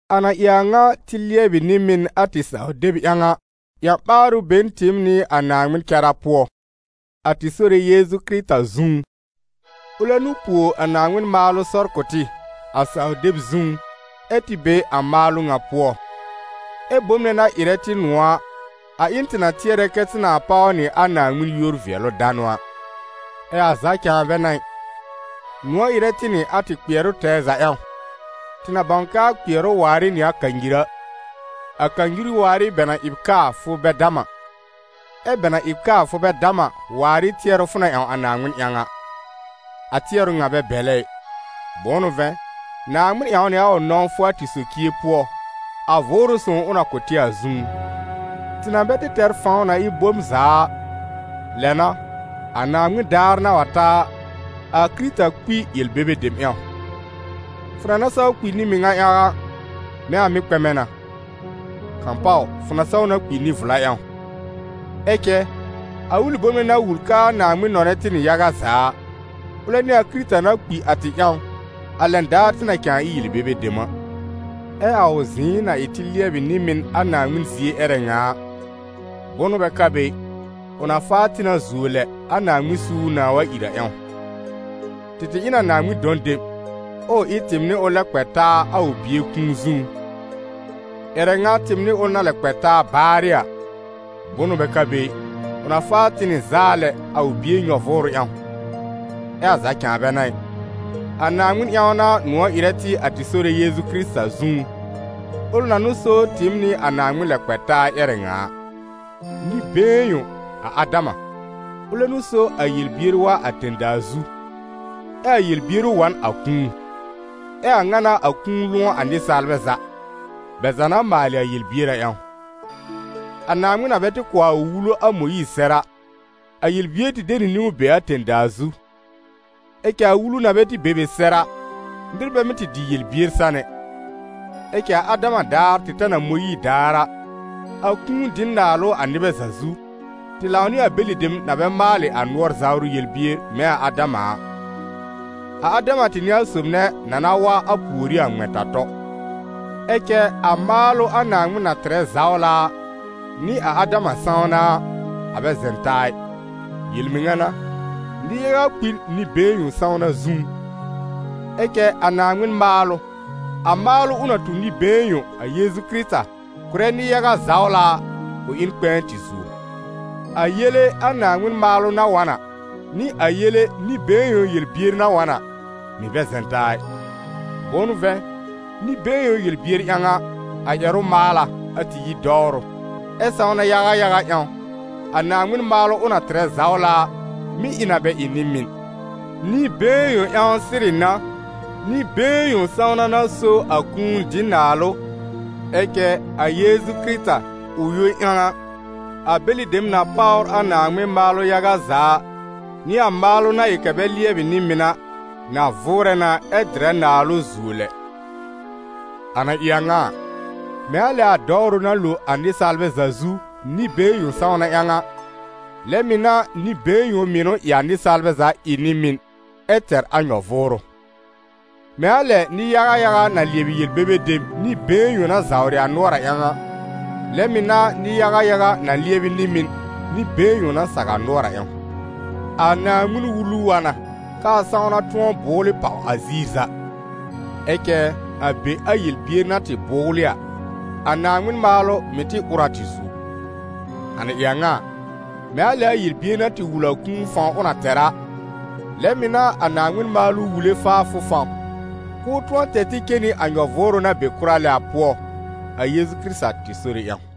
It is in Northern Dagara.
A na ɩ a ŋa tɩ lɩɛbɩ nɩ-mɩn a tɩ saw-deb ƴãw a, ƴã-ɓaarʋ be n tɩɩm nɩ a Naaŋmɩn cara pʋɔ, a tɩ Sore Yeezu Kɩrɩta zũú. Ʋlɛ n'ʋ puo a Naaŋmɩn maalʋ sɔr kʋ̀ tɩ, a saw-deb zũú, ɛ́ tɩ be a maalʋ ŋa pʋɔ. Ɛ bom nɛ na ɩrɛ tɩ nʋ̃ɔ̀ a, a ɩ n tɩ na tɩɛrɛ kɛ tɩ nãà páw nɩ a Naaŋmɩn yúor-vɩɛlʋ-danʋ a. Ɛ a za cãa bɛ n'a ɩ, nʋ̃ɔ̀ ɩrɛ tɩ nɩ a tɩ kpɩɛrʋ tɛɛ za ƴãw, tɩ na bãw k'aa kpɩɛrʋ waar ɩ nɩ a kanyir a, a kanyir waar ɩ bɛ na ɩ b kaa fʋ bɛ dam a, ɛ́ bɛ na ɩ b kaa fʋ bɛ dam a, waar ɩ tɩɛrʋ fʋ na ƴãw a Naaŋmɩn ƴãw a. A tɩɛrʋ ŋa bɛ bɛ̀lɛ ɩ; bʋ̃ʋ n'ʋ vɛ̃, Naaŋmɩn ƴãw nɩ a ʋ nɔ̃wfʋ a tɩ socie pʋɔ, a Vʋʋrʋ Sõw ʋ na kʋ̀ tɩ a zũú. Tɩ na bɛ tɩ tɛr fãw na ɩ bom za a, lɛ n'a, a Naaŋmɩn daar na wa ta a, a Kɩrɩta kpi yel-bebe dem ƴãw. Fʋ na na saw kpi nɩ-mɩŋa ƴãw a, mɛ̃ a mɩ́ kpɛmɛ na; kãpaw fʋ na saw na kpi nɩ-vla ƴãw. Ɛ cɛ, a ʋlɩ bom nɛ na wul k'aa Naaŋmɩn nɔnɛ tɩ nɩ yaga za a, ʋlɛ n'ɩ a Kɩrɩta na kpi a tɩ ƴãw, a lɛn daar tɩ na cãa ɩ yel-bebe dem a. Ɛ a ʋ zɩ̃ɩ na ɩ tɩ lɩɛbɩ nɩ-mɩn a Naaŋmɩn zie ƴɛrɛ ŋa a, bʋnʋ bɛ ka be ɩ, ʋ na faa tɩ na zuo lɛ a Naaŋmɩn suur nãà wa ìr a ƴãw. Tɩ tɩ ɩ n a Naaŋmɩn dɔ̃ dem, ʋʋ ɩ tɩɩm nɩ ʋl lɛb kpɛ taa a ʋ Bie kũu zũú. Ƴɛrɛ ŋa tɩɩm nɩ ʋl na lɛb kpɛ taa baarɩ a, bʋnʋ bɛ ka be ɩ, ʋ na faa tɩ nɩ zaa lɛ a ʋ Bie nyɔ-vʋʋrʋ ƴãw. Ɛ a za cãa bɛ n'a ɩ, a Naaŋmɩn ƴãw n'a nʋ̃ɔ̀ ɩrɛ tɩ a tɩ Sore Yeezu Kɩrɩta zũú, ʋl na n'ʋ so tɩɩm nɩ a Naaŋmɩn lɛb kpɛ taa ƴɛrɛ ŋa a. Nɩ-been yõ, a Adama, ʋlɛ n'ʋ so a yel-bier wa a tẽ-daa zu, ɛ a yel-bier ʋ wa n a kũu. Ɛ a a ŋa n'a a kũu lʋ̃ɔ a nɩsaalbɛ za, bɛ za na maalɩ a yel-bier a ƴãw. A Naaŋmɩn na bɛ tɩ kʋ̀ a ʋ Wulu a Mõyiir sɛr a, a yel-bier tɩ de nɩ niwn be a tẽ-daa zu; ɛ cɛ a Wulu na bɛ tɩ be be sɛr a, nɩr bɛ mɩ́ tɩ dɩ yel-bier san ɛ. Ɛ cɛ a Adama daar tɩ ta n a Mõyiir daar a, a kũu dɩ n naalʋ a nɩbɛ za zu, tɩ lãw nɩ a bɛlɩ dem na bɛ maalɩ a nʋɔr zawrʋ yel-bier mɛ̃ a Adama a. A Adama tɩ n'ɩ a sob nɛ na na wa a pùorí a ŋmɛ̃-ta-tɔ. Ɛ cɛ a maalʋ a Naaŋmɩn na tɩrɛ zawla a, nɩ a Adama sãwna a, a bɛ zɛ̃ taa ɩ. Yel-mɩŋa n'a, nɩ-yaga kpi n nɩ-been yõ sãwna zũú; ɛ cɛ a Naaŋmɩn maalʋ, a maalʋ ʋ na tu nɩ-been yõ, a Yeezu Kɩrɩta, kʋ̀rɛ nɩ-yaga zawla a, ʋ ɩ n kpɛ̃ɛ tɩ zuo. A yele a Naaŋmɩn maalʋ na wa n a, nɩ a yele nɩ-been yõ yel-bier na wa n a, mɩ̀ bɛ zɛ̃ taa ɩ: bʋ̃ʋ n'ʋ vɛ̃, nɩ-been yõ yel-bier ƴãw a, a ƴɛrʋ maal a, a tɩ yi dɔwrʋ, ɛ sãwna yaga yaga ƴãw, a Naaŋmɩn maalʋ ʋ na tɩrɛ zawla a, mɩ́ ɩ na bɛ ɩ nɩ-mɩn. Nɩ-been yõ ƴãw sɩrɩ n'a, nɩ-been yõ sãwna n'a so a kũu dɩ naalʋ, ɛ cɛ a Yeezu Kɩrɩta, ʋ yõ ƴãw a, a bɛlɩ dem na páwr a Naaŋmɩn maalʋ yaga za a, nɩ a maalʋ na ɩ kɛ bɛ lɩɛbɩ nɩ-mɩn a, na vʋʋrɛ na ɛ dɩrɛ naalʋ zuo lɛ. A na ɩ a ŋa a, mɛ̃ a lɛ a dɔwrʋ na lo a nɩsaalbɛ za zu, nɩ-been yõ sãwna ƴãw a, lɛ mɩ̀ n'a nɩ-been yõ mɩnʋ ɩ a nɩsaalbɛ za ɩ nɩ-mɩn ɛ tɛr a nyɔ-vʋʋrʋ. Mɛ̃ a lɛ nɩ-yaga yaga na lɩɛbɩ yel-bebe dem nɩ-been yõ na zawrɩ a nʋɔr a ƴãw a, lɛ mɩ̀ n'a nɩ-yaga yaga na lɩɛbɩ nɩ-mɩn nɩ-been yõ na saw a nʋɔr a ƴãw. A Naaŋmɩn-Wulu wa na k'aa sãwna tʋ̃ɔ bʋ́wlɩ pàw a ziir za; ɛ cɛ a be a yel-bier na tɩ bʋ́wlɩ a, a Naaŋmɩn maalʋ mɩ̀ tɩ ʋr a tɩ zuo. A na ɩ a ŋa a, mɛ̃ a lɛ a yel-bier na tɩ wul a kũu fãw ʋ na tɛr a, lɛ mɩ̀ n'a a Naaŋmɩn maalʋ wule faafʋ fãw, k'ʋʋ tʋ̃ɔ tɛr tɩ cen nɩ a nyɔ-vʋʋrʋ na be kʋra lɛ a pʋɔ, a Yeezu Kɩrɩta tɩ Sore ƴãw.